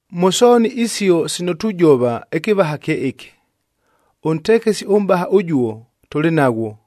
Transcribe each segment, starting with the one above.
Mʉ sooni isio sino tujova ɨkɨvaha kye ɨkɨ: ʉntekesi ʉmʼbaha ʉjuo, tʉlɨ naghwo,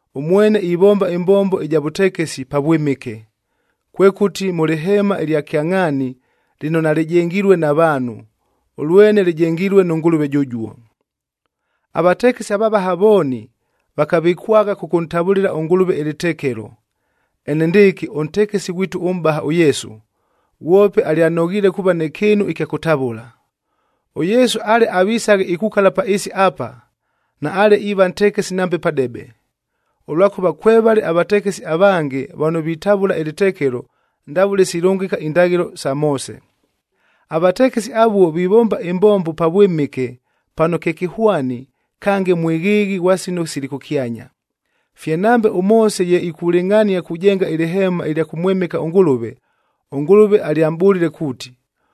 Ʉmwene ivomba ɨmbombo ɨja vʉtekesi Pavwɨmɨke, kwekʉti mʉ lɨheemab ɨlya kyangʼhaani lɨno nalɨjengilue na vaanhu, ʉlwene lɨjengilue nʉ Ngʉlʉve jʉjuo. Avatekesi avavaha vooni vakavɨkwagha kʉkʉntavʉlɨla ʉNgʉlʉve ɨlɨtekelo, enendɨɨkɨ ʉntekesi ghwitu ʉmʼbaha ʉYesu, ghwope alyanoghiile kuuva nɨ kɨɨnu ɨkya kʉtavʉla. ɄYesu ale avisaghe ikukala pa ɨɨsi apa, naale iiva ntekesi nambe padebe, ʉlwakʉva kwevale avatekesi avange vano vitavʉla ɨlɨtekelo ndavʉle silʉngɨka indaghɨlo sa Moose. Avatekesi avuo vivomba ɨmbombo Pavwɨmɨke pano kye kɨhwani kange mwɨghɨɨghɨ ghwa sino sili kʉkyanya. Fye nambe ʉMoose ye ikulɨngʼhania kujenga ɨlɨheema ɨlya kʉmwɨmɨka ʉNgʉlʉve, ʉNgʉlʉve alyamʼbʉlile kuuti,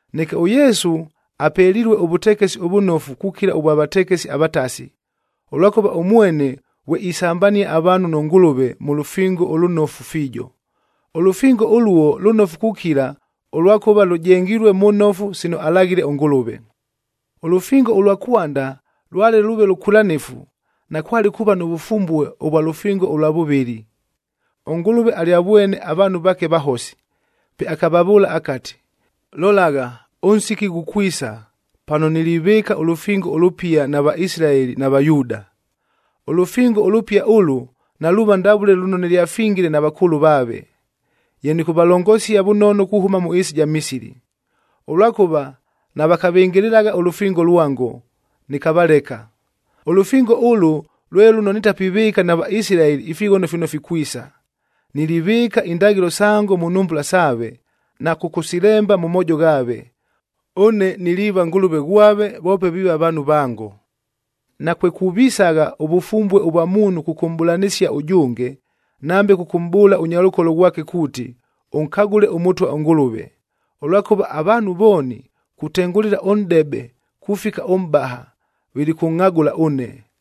Neke ʉYesu apelilue ʉvʉtekesi ʉvʉnofu kukila ʉvwa vatekesi avatasi, ʉlwakʉva ʉmwene ghwe isambania avaanhu nʉ Ngʉlʉve mʉ lʉfingo ʉlʉnofu fiijo. Ʉlʉfingo ʉluo lʉnofu kukila ʉlwakʉva lʉjengilue mʉ nofu sino alaghile ʉNgʉlʉve. Ʉlʉfingo ʉlwa kwanda lwale lʉʉve lʉkwɨlanɨfu, nakwale kuuva nʉ vʉfumbue ʉvwa lʉfingo ʉlwa vʉvɨlɨ. ɄNgʉlʉve alyavwene avaanhu vaake vahosi. Pe akavavʉʉla akati, “Lolagha, ʉnsiki ghukwisa, pano nilivɨɨka ʉlʉfingo ʉlʉpia na Vaisilaeli na Vayuuda. Ʉlʉfingo ʉlʉpia ʉlʉ, naluuva ndavʉle lʉno nɨlyafingile na vakʉʉlʉ vaave, ye nɨkʉvalongosia vʉnono kuhʉma mʉ ɨɨsi ɨja Misili. Ʉlwakʉva navakavɨngɨlɨlagha ʉlʉfingo lwango, nɨkavaleka. Ʉlʉfingo ʉlʉ lwe lʉno nitapivɨɨka na Vaisilaeli ifighono fino fikwisa. Nilivɨɨka indaghɨlo sango mʉ nhumbula saave, na kʉkʉsilemba mʉ moojo ghaave. Ʉne niliiva Ngʉlʉve ghwave, voope viiva vaanhu vango. Nakwekuvisagha ʉvʉfumbue ʉvwa muunhu kʉkʉmʼbʉlanɨsia ʉjʉnge, nambe kʉkʉmʼbʉʉla ʉnyalʉkolo ghwake kuuti, ‘Ʉnkagʉle ʉMʉtwa ʉNgʉlʉve,’ ʉlwakʉva avaanhu vooni, kutengʉlɨla ʉnʼdebe kufika ʉmʼbaha, vilikʉngʼhagʉla ʉne.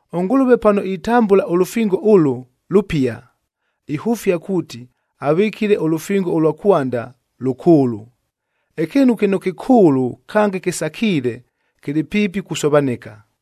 ɄNgʉlʉve pano itambʉla ʉlʉfingo ʉlʉ, “Lʉpia,” ihʉfia kuuti avɨkile ʉlʉfingo ʉlwa kwanda, “Lʉkʉʉlʉ.” Ɨkɨɨnu kɨno kɨkʉʉlʉ kange kɨsakiile, kɨlɨ piipi kusovanɨka.